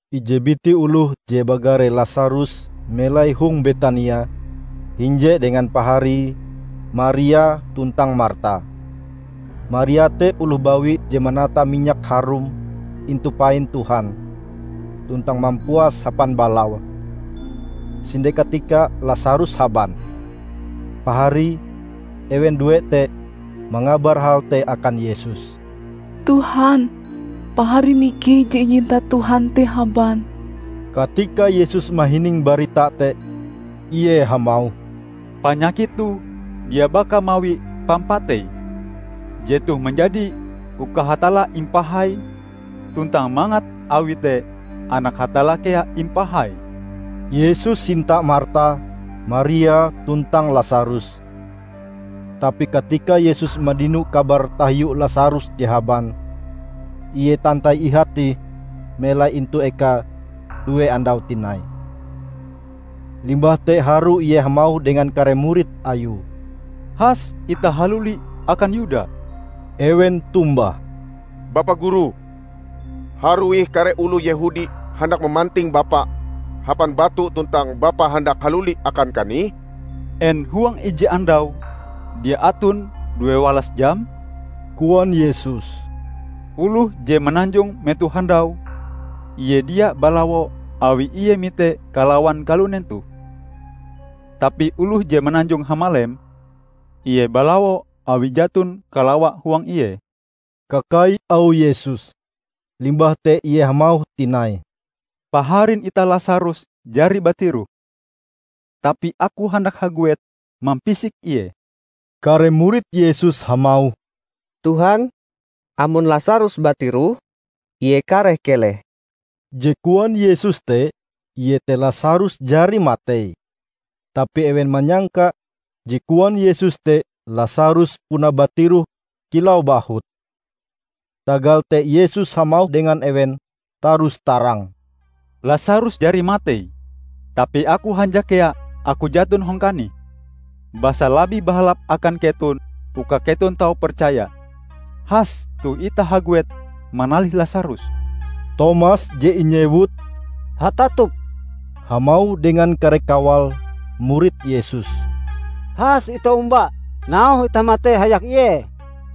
Ije biti oloh je bagare Lasarus melai hong Betania hinje dengan paharie Maria tuntang Marta. Maria te oloh bawi je manata minyak harum intu pain Tuhan, tuntang mampuase hapan balaue. Sinde katika Lasarus haban. Paharie, ewen due te, mangabar hal te akan Yesus, "Tuhan, paharin ikei je inyinta Tuhan te haban." Katika Yesus mahining barita te, Ie hamauh, "Panyakit toh dia baka mawi pampatei. Jetoh manjadi uka Hatalla impahai tuntang mangat awi te Anak Hatalla kea impahai." Yesus sinta Marta, Maria tuntang Lasarus. Tapi katika Yesus mandino kabar tahiu Lasarus je haban, ie tantai ihate ih melai intu ekae due andau tinai. Limbah te harue Ie hamauh dengan kare murid Ayue, "Has itah haluli akan Yuda." Ewen tombah, "Bapa Guru, harue ih kare oloh Yehudi handak mamanting Bapa hapan batu tuntang Bapa handak haluli akan kanih?" "En huang ije andau dia aton due walas jam?" koan Yesus. "Oloh je mananjong metoh handau, ie dia balawo awi ie mite kalawan kalunen toh. Tapi oloh je mananjong hamalem, ie balawo awi jaton kalawa huang ie." Kakai auh Yesus. Limbah te Ie hamauh tinai, "Paharin itah Lasarus jari batiroh, tapi Aku handak haguet mampisik ie." Kare murid Yesus hamauh, "Tuhan, amon Lasarus batiroh, ie kareh keleh." Je koan Yesus te, iete Lasarus jari matei. Tapi ewen manyangka je koan Yesus te Lasarus puna batiroh kilau bahut. Tagal te Yesus hamauh dengan ewen tarus-tarang, "Lasarus jari matei. Tapi Aku hanjak kea Aku jaton hong kanih, basa labih bahalap akan keton, uka keton tau percaya. Has toh itah haguet manalih Lasarus." Tomas je inyewut "Hatatup" hamauh dengan kare kawale murid Yesus, "Has itah omba, nauhe itah matei hayak Ie!"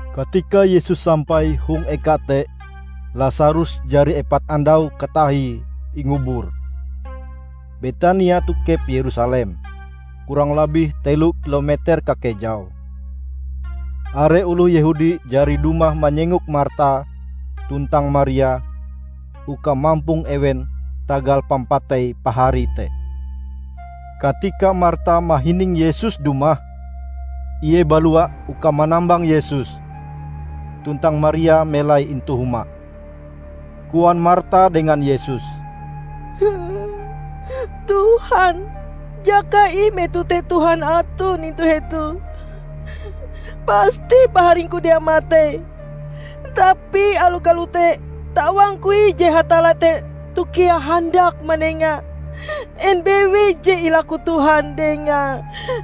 Katika Yesus sampai hong eka te, Lasarus jari epat andau katahie ingubur. Betania tokep Yerusalem, kurang labih telo kilometer kakejaue. Are oloh Yehudi jari dumah manyengok Marta tuntang Maria uka mampong ewen tagal pampatei paharie te. Katika Marta mahining Yesus dumah, ie balua uka manambang Yesus, tuntang Maria melai intu huma. Koan Marta dengan Yesus, "Tuhan, jakae ih metoh te Tuhan aton intu hetoh, pasti paharingku dia matei. Tapi aloh kalote, tawangku ih je Hatalla te toh kea handak manenga en bewei je ilaku Tuhan Dengae."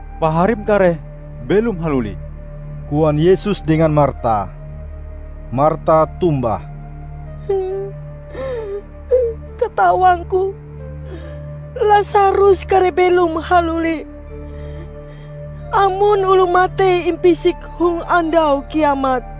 "Paharim kareh belom haluli," koan Yesus dengan Marta. Marta tombah, "Katawangku Lasarus kareh belom haluli amon oloh matei impisik hong Andau Kiamat."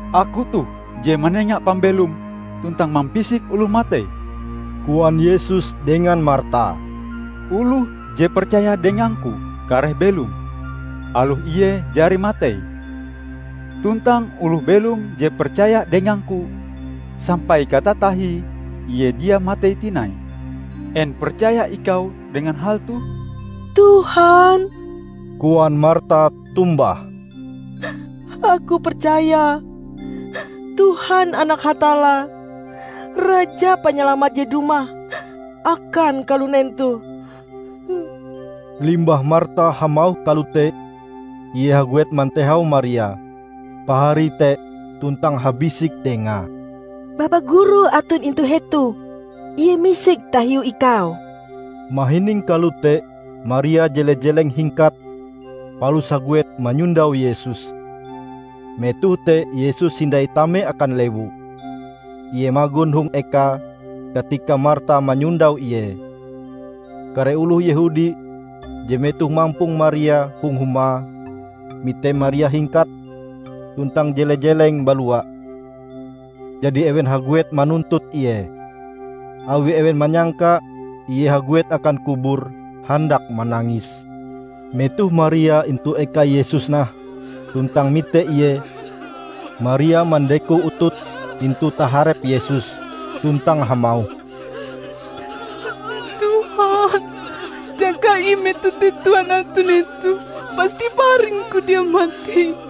"Aku toh je manenga pambelom tuntang mampisik oloh matei," koan Yesus dengan Marta. "Oloh je percaya dengang-Ku kareh belom, aloh ie jari matei. Tuntang oloh belom je percaya dengang-Ku, sampai katatahie ie dia matei tinai. En percaya ikau dengan hal toh?" "Tuhan," koan Marta tombah, "aku percaya Tuhan Anak Hatalla, Raja Panyalamat je dumah akan kalunen toh." Limbah Marta hamauh kalote, ie haguet mantehau Maria, paharie te tuntang habisik dengae, "Bapa Guru aton intu hetoh; Ie misek tahiu ikau." Mahining kalote, Maria jele-jeleng hingkat palus haguet manyondau Yesus. Metoh te Yesus hindai tame akan lewu. Ie magon hong ekae katika Marta manyondau Ie. Kare oloh Yehudi je metohe mampong Maria hong huma, mite Maria hingkat tuntang jele-jeleng balua; jadi ewen haguet manuntut ie, awi ewen manyangka ie haguet akan kubur handak manangis. Metoh Maria intu eka Yesus nah tuntang mite ie, Maria mandeko utute intu taharep Yesus tuntang hamauh, "Tuhan, jakae ih metoh te Tuhan aton hetoh, pasti paharingku dia matei."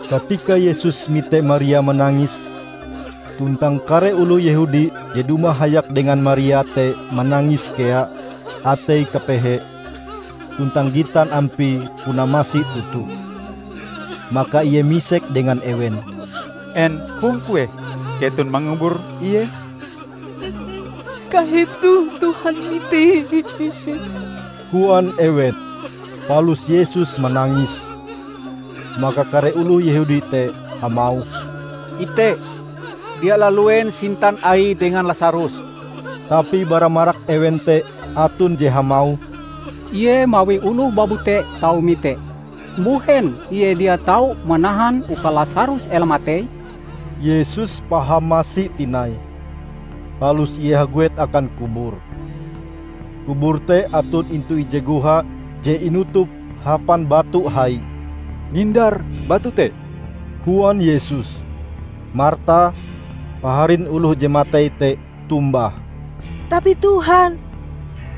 Katika Yesus mite Maria manangis, tuntang kare oloh Yehudi je dumah hayak dengan Maria te manangis kea, ateie kapehe, tuntang gitan ampie puna masi toto. Maka Ie misek dengan ewen, "En hong kueh keton mangubur ie?" "Kahetoh Tuhan mitee," koan ewen. Palus Yesus manangis. Maka kare oloh Yehudi te hamauh, "Ite, dia laluen sintan Aie dengan Lasarus!" Tapi bara marak ewen te aton je hamauh, "Ie mawi oloh babute tau mite, mbuhen Ie dia tau manahan uka Lasarus ela matei?" Yesus paham masi tinai, palus Ie haguet akan kubur. Kubur te aton intu ije goha je inutup hapan batu hai. "Nindar batu te," koan Yesus. Marta, paharin oloh je matei te tombah, "Tapi Tuhan,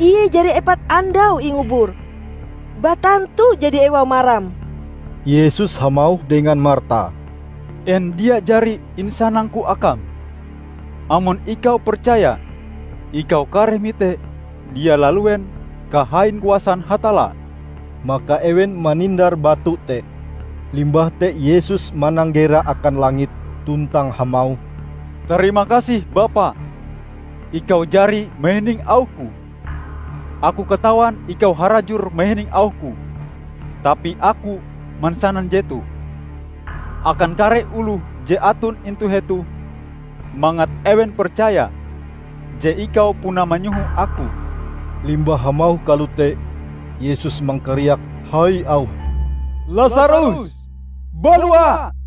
ie jari epat andau ingubur. Batantu jadi ewau maram!" Yesus hamauh dengan Marta, "En dia jari insanang-Ku akam: amon ikau percaya, ikau kareh mite dia laluen kahain kuasan Hatalla!" Maka ewen manindar batu te. Limbah te Yesus mananggera akan langit tuntang hamauh, "Tarimakasih Bapa, Ikau jari mahining auh-Ku. Aku katawan Ikau harajur mahining auh-Ku, tapi Aku mansanan jetoh, akan kare oloh je aton intu hetoh; mangat ewen percaya je Ikau puna manyoho Aku." Limbah hamauh kalote, Yesus mangkariak hai auhe, "Lasarus, balua!"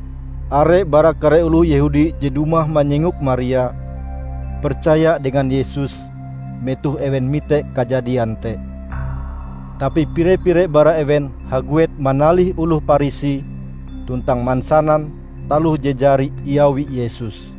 Are bara kare oloh Yehudi je dumah manyengok Maria, percaya dengan Yesus metoh ewen mite kajadian te. Tapi pire-pire bara ewen haguet manalih oloh Parisi tuntang mansanan taloh je jari iawi Yesus.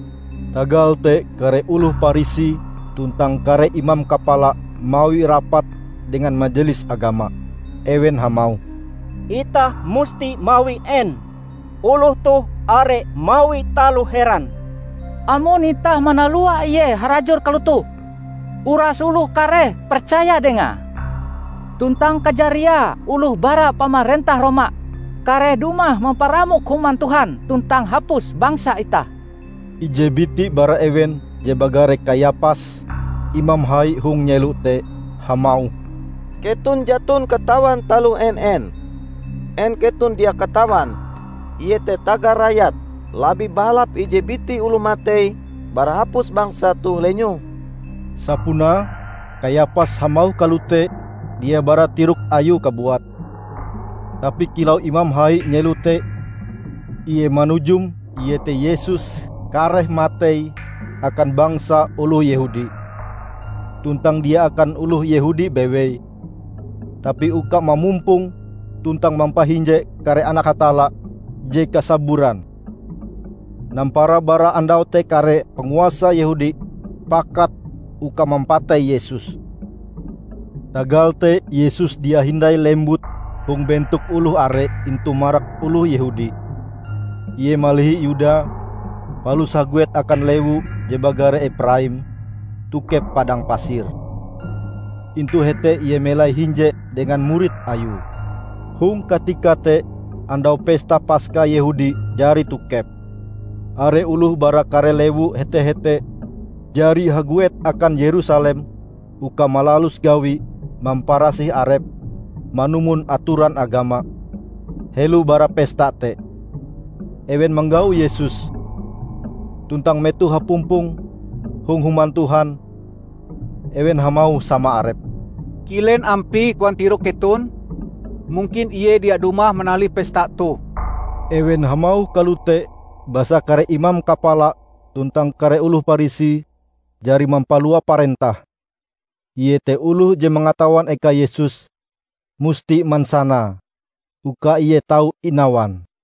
Tagal te kare oloh Parisi tuntang kare imam kapala mawi rapat dengan Majelis Agama. Ewen hamauh, "Itah musti mawi en? Oloh toh are mawi taloh heran! Amon itah manalua Ie harajur kalotoh, uras oloh kareh percaya dengae. Tuntang kajariae oloh bara pamarentah Roma kareh dumah mamparamok Human Tuhan tuntang hapus bangsa itah!" Ije biti bara ewen je bagare Kayapas, imam hai hong nyelo te, hamauh, "Keton jaton katawan taloh en-en. En keton dia katawan, iete tagal rakyat, labih bahalap ije biti oloh matei bara hapus bangsa toh lenyoh?" Sapunae, Kayapas hamauh kalote, dia bara tirok ayue kabuat. Tapi kilau imam hai nyelo te ie manujum iete Yesus kareh matei akan bangsa oloh Yehudi. Tuntang dia akan oloh Yehudi bewei, tapi uka mamumpong tuntang mampahinje kare anak Hatalla je kasaburan. Nampara bara andau te kare panguasa Yehudi pakat uka mampatei Yesus. Tagal te Yesus dia hindai lembut hong bentok oloh are intu marak oloh Yehudi. Ie malihi Yuda, palus haguet akan lewu je bagare Epraim tokep padang pasir. Intu hete Ie melai hinje dengan murid Ayue. Hong katika te, Andau Pesta Paska Yehudi jari tokep. Are oloh bara kare lewu hete-hete jari haguet akan Yerusalem uka malalus gawi mamparasih arepe manumon atoran agama, helo bara pesta te. Ewen manggau Yesus, tuntang metoh hapumpong hong Human Tuhan, ewen hamauh sama arepe, "Kilen ampie koan tirok keton? Mungkin Ie dia dumah manalih pesta toh." Ewen hamauh kalote basa kare imam kapala tuntang kare oloh Parisi jari mampalua parentah, iete oloh je mangatawan eka Yesus, musti mansanae, uka Ie tau inawan.